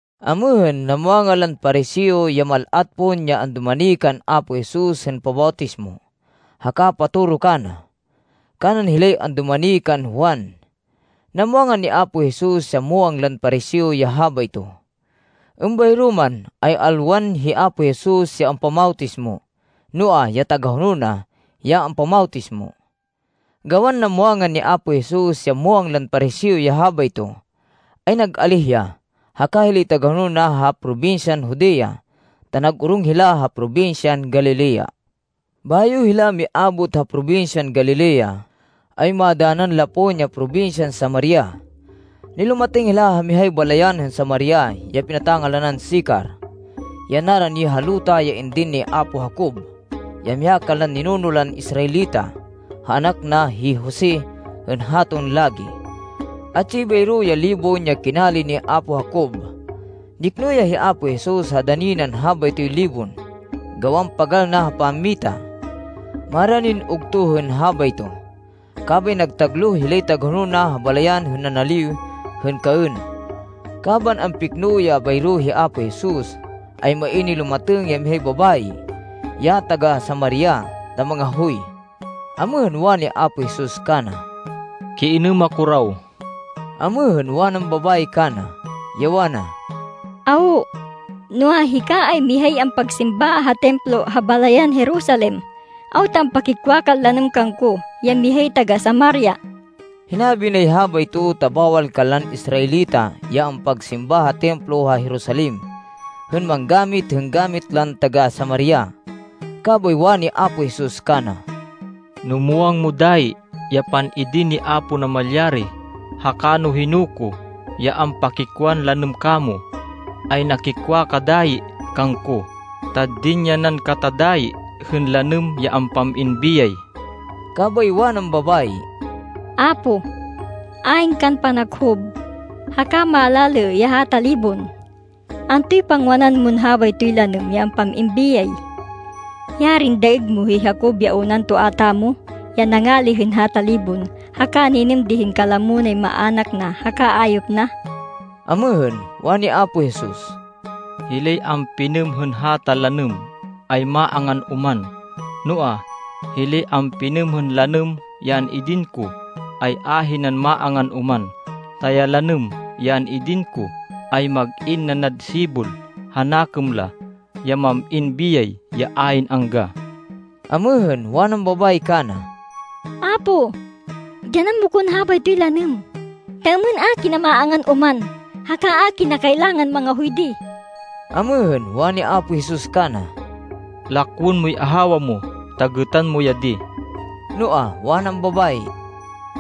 Amêhên, namwangan lan Pariseo ya mal-at pon ya andumani kan Apo Jesus hên pabawtismo haka patoro kana, kanan hilay andumani kan Juan. Namwangan ni Apo Jesus ya muwang lan Pariseo ya habayto. Êmbayro man, ay alwan hi Apo Jesus ya ampamawtismo, noa, ya tagahonol na ya ampamawtismo. Gawan namwangan ni Apo Jesus ya muwang lan Pariseo ya habayto, ay nag-alíh ya, haka hilay tagahonol na ha probinsyan Judea, ta nag-orong hila ha probinsyan Galilea. Bayo hila miabot ha probinsyan Galilea, ay madanan la pon ya probinsyan Samaria. Nilumatêng hila ha mihay balayan hên Samaria ya pinata-ngalanan Sicar, ya narani ha luta ya indin ni apo Jacob, ya miha kanlan ninuno lan Israelita, ha anak na, hi Jose hên haton lagi. Atsi bayro ya libon ya kinali ni apo Jacob. Nikno ya hi Apo Jesus ha dani nan habaytoy libon, gawan pagal na ha pammita. Maranin ugto hên habayto. Kabay nagtagloh hilay tagahonol na ha balayan hên nanaliw hên kaên. Kaban ampikno ya bayro hi Apo Jesus, ay main nilumatêng ya mihay babayi, ya taga-Samaria ta mangahoy. Amêhên, wani Apo Jesus kana, “Kiinêm ako raw.” Amêhên, wanan babayi kana, ya wana, “Awo, noa, hika ay mihay ampagsimba ha Templo ha balayan Jerusalem, awta ampakikwa kan lanêm kangko, ya mihay taga-Samaria?” Hinabi nay habayto ta bawal kanlan Israelita ya ampagsimba ha Templo ha Jerusalem, hên manggamit hên gamit lan taga-Samaria. Kabay wani Apo Jesus kana, “No muwang mo dayi ya pan-idin ni Apo Namalyari, haka no hino ko, ya ampakikwan lanêm kamo, ay nakikwa ka dayi kangko, ta dinyanan kata dayi hên lanêm, ya ampam-in biyay.” Kabay wanan babayi, “Apo, ayn kan panakhub, haka malalê ya hata libon. Antoy pangwanan mon habaytoy lanêm ya ampam-in biyay? Yarin daêg mo hi Jacob ya unan toa tamo, ya nangali hên hata libon, haka ninêm di hên kalamo nay maának na haka ayop na!” Amêhên, wani Apo Jesus, “Hilay ampinêm hên hata lanêm ay maangan oman. Noa, hilay ampinêm hên lanêm ya an-idin ko, ay ahinan maangan oman, ta ya lanêm ya an-idin ko, ay mag-in nanad sibol ha nakêm la, ya mam-in biyay ya ayn angga.” Amêhên, wanan babayi kana, “Apo, dyanan mo kon habaytoy lanêm, ta êmên a kina maangan oman, haka a kina kailangan mangahoy di.” Amêhên, wani Apo Jesus kana, “Lakwên moy ahawa mo, ta gêtan mo ya di.” Noa, wanan babayi,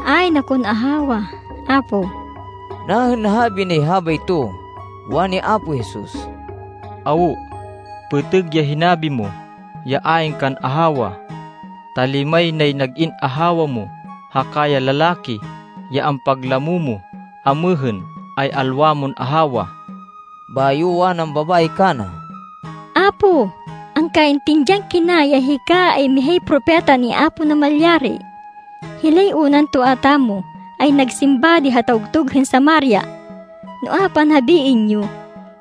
“Ayn akon ahawa, Apo.” Nahên nahabi nay habayto, wani Apo Jesus, “Awo, pêtêg ya hinabi mo, ya ayn kan ahawa. Ta limay nay nag-in ahawa mo, haka ya lalaki, ya ampaglamo mo amêhên, ay alwa mon ahawa.” Bayo, wanan babayi kana, “Apo, angkaintindihan kina ya hika, ay mihay propeta ni Apo Namalyari. Hilay unan toa tamo, ay nagsimba di ha tawgtug hên Samaria. Noa, panhabiên yo,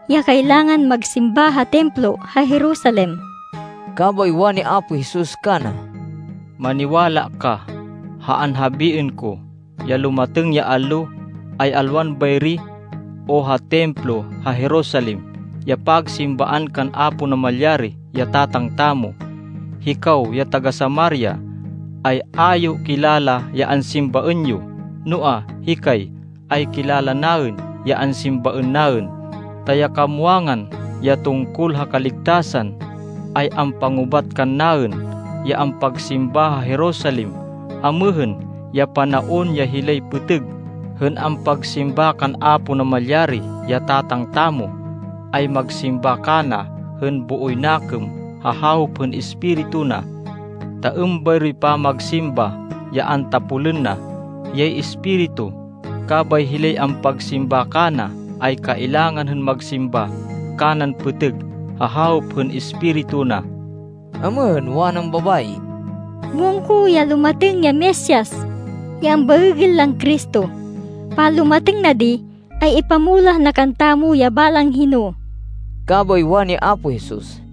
ya kailangan magsimba ha Templo ha Jerusalem.” Kabay wani Apo Jesus kana, “Maniwala ka ha anhabiên ko, ya lumatêng ya allo, ay alwan bayri, o ha Templo ha Jerusalem ya pagsimbaan kan Apo Namalyari, ya Tatang tamo. Hikaw ya taga-Samaria, ay a yo kilala ya ansimbaên yo. Noa, hikay, ay kilala naên ya ansimbaên naên, ta ya kamwangan, ya tungkol ha kaligtasan, ay ampangubat kannaên, ya ampagsimba ha Jerusalem. Amêhên ya panaon ya hilay pêtêg hên ampagsimba kan Apo Namalyari, ya Tatang tamo, ay magsimba kana hên booy nakêm ha hawop hên Espiritu na. Ta êmbayroy pamagsimba ya antapolên na. Hiyay Espiritu. Kabay hilay ampagsimba kana ay kailangan hên magsimba kanan pêtêg ha hawop hên Espiritu na.” Amêhên, wanan babayi, “Muwang ko ya lumatêng ya Mesias, ya ambaêgên lan Cristo. Panlumatêng na di, ay ipamulah na kantamo ya balang hino.” Kabay wani Apo Jesus,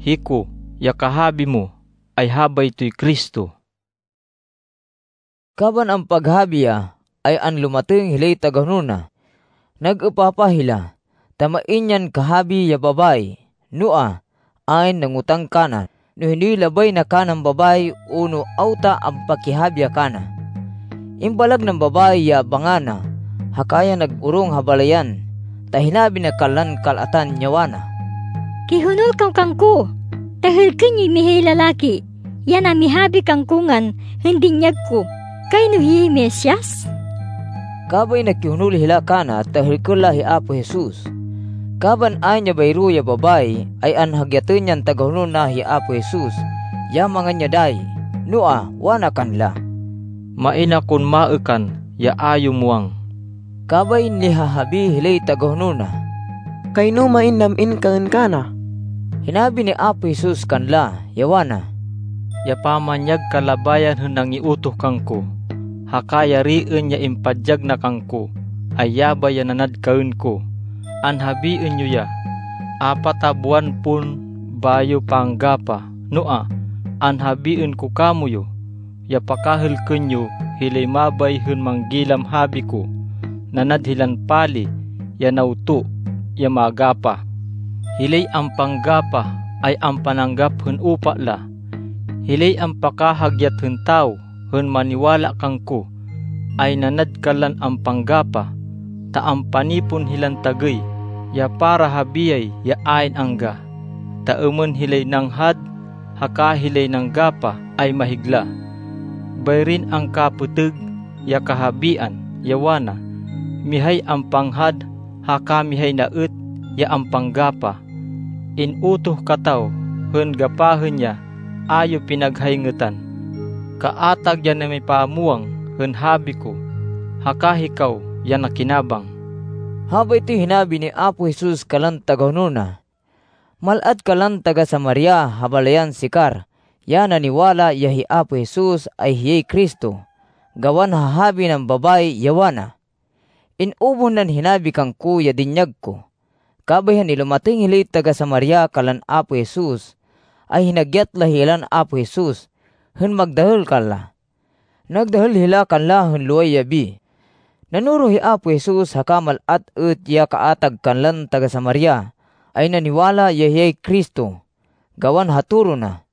“Hiko, ya kahabi mo ay habaytoy Cristo.” Kaban ampaghabi ya, ay anlumatêng hilay tagahonol na. Nag-êpapah hila, ta main yan kahabi ya babayi. Noa, ayn nangotang kana no hinoy labay na kanan babayi o no awta ampakihabi ya kana. Imbalag nan babayi ya banga na, haka ya nag-orong ha balayan, ta hinabi na kanlan kal-atan, ya wana, “Kihonol kaw kangko ta hêlkên yoy mihay lalaki, ya namihabi kangko ngan hên dinyag ko. Kayno hiyay Mesias.” Kabay nakihonol hila kana ta hêlkên la hi Apo Jesus. Kaban ayn ya bayro ya babayi, ay anhagyatên yan tagahonol na hi Apo Jesus, ya mangan ya dayi. Noa, wana kanla, “Main akon maêkan ya a yo muwang.” Kabay nihahabi hilay tagahonol na, “Kayno main nam-in kaên kana.” Hinabi ni Apo Jesus kanla, ya wana, “Ya pamanyag kalabayan hên nangiutoh kangko, haka yariên ya impadyag na kangko, ay yabay ya nanad kaên ko.” “Anhabiên yo ya, ‘Apat a buwan pon bayo panggapah.’ Noa, anhabiên ko kamoyu, ya pakahêlkên yo hilay mabay hên manggilam habi ko. Nanad hilan pali ya nawto ya magapah. Hilay ampanggapah ay ampananggap hên upa la. Hilay ampakahagyat hên tawo hên maniwala kangko, ay nanad kanlan ampanggapah, ta ampanipon hilan tagêy ya para ha biyay ya ayn angga, ta êmên hilay nanghad, haka hilay nanggapah ay maghigla. Bayrin angka-pêtêg ya kahabian, ya wana, ‘Mihay ampanghad haka mihay na êt ya ampanggapah.’ In-utoh kataw hên gapahên ya a yo pinaghayngêtan. Kaatag ya namipamwang hên habi ko, haka hikaw ya nakinabang.” Habaytoy hinabi ni Apo Jesus kanlan tagahonol na. Mal-at kanlan taga-Samaria ha balayan Sicar ya naniwala, ya hi Apo Jesus, ay hiyay Cristo, gawan ha habi nan babayi, ya wana, “In-ubuh nan hinabi kangko ya dinyag ko.” Kabay hên nilumatêng hilay taga-Samaria kanlan Apo Jesus, ay hinagyat la hilan Apo Jesus hên magdahêl kanla. Nagdahêl hila kanla hên loway yabi. Nanoro hi Apo Jesus haka mal-at êt ya kaatag kanlan taga-Samaria ay naniwala ya hiyay Cristo, gawan ha toro na.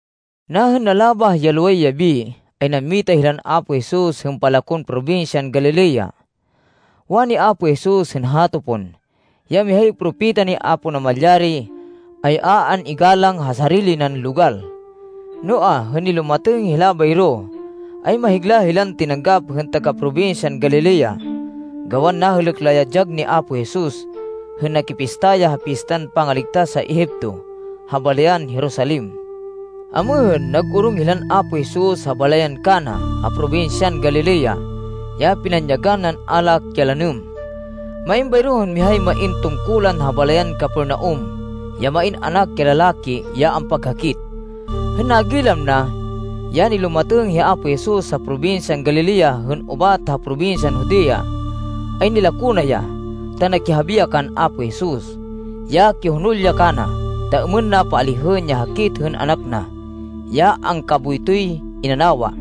Nahên nalabah ya loway yabi, ay nammita hilan Apo Jesus hên palakon probinsyan Galilea. Wani Apo Jesus hên hato pon, ya mihay propeta ni Apo Namalyari, ay a an-igalang ha sarili nan logal. Noa, hên nilumatêng hila bayro, ay mahigla hilan tinanggap hên taga-probinsyan Galilea, gawan nahêlêk la ya dyag ni Apo Jesus, hên nakipista ya ha Pistan Pangaligtas ha Egipto ha balayan Jerusalem. Amêhên, nag-orong hilan Apo Jesus ha balayan Cana, ha probinsyan Galilea, ya pinanyagan nan alak ya lanêm. Main bayro hên mihay main tungkulan ha balayan Capernaum, ya main anak ya lalaki ya ampaghakit. Hên nagilam na, ya nilumatêng hi Apo Jesus ha probinsyan Galilea hên ubat ha probinsyan Judea, ay nilako na ya, ta nakihabi ya kan Apo Jesus, ya kihonol ya kana, ta êmên na paalihên ya hakit hên anak na, ya angkaboytoy inanawa.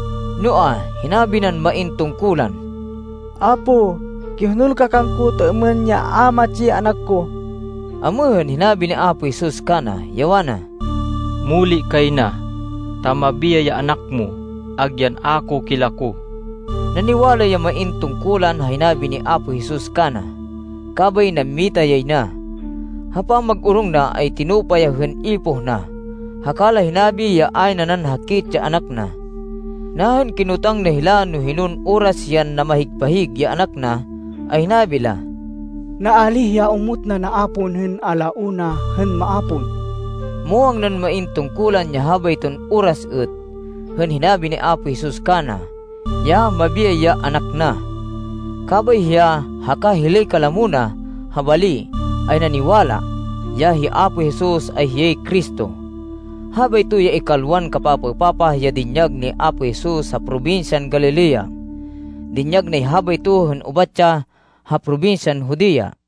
Noa, hinabi nan main tungkulan, “Apo, kihonol ka kangko ta êmên ya a matsi ya anak ko.” Amêhên, hinabi ni Apo Jesus kana, ya wana, “Muli kay na, ta mabiyay ya anak mo, agyan a ko kilako.” Naniwala ya main tungkulan ha hinabi ni Apo Jesus kana, kabay nammita yay na. Ha pamag-orong na ay tinupa ya hên ipoh na, haka la hinabi ya ayn nanan hakit ya anak na. Nahên kinotang na hila no hinon oras yan namahig-pahig ya anak na, ay hinabi la, “Naalíh ya omot na naapon hên a la una hên maapon.” Muwang nan main tungkulan ya habayton oras êt, hên hinabi ni Apo Jesus kana, ya, mabiyay ya anak na. Kabay hiya, haka hilay kalamo na ha bali, ay naniwala, ya hi Apo Jesus, ay hiyay Cristo. Habayto ya ikalwan kapapaêpapah ya dinyag ni Apo Jesus ha probinsyan Galilea. Dinyag nay habayto hên ubat ya ha probinsyan Judea.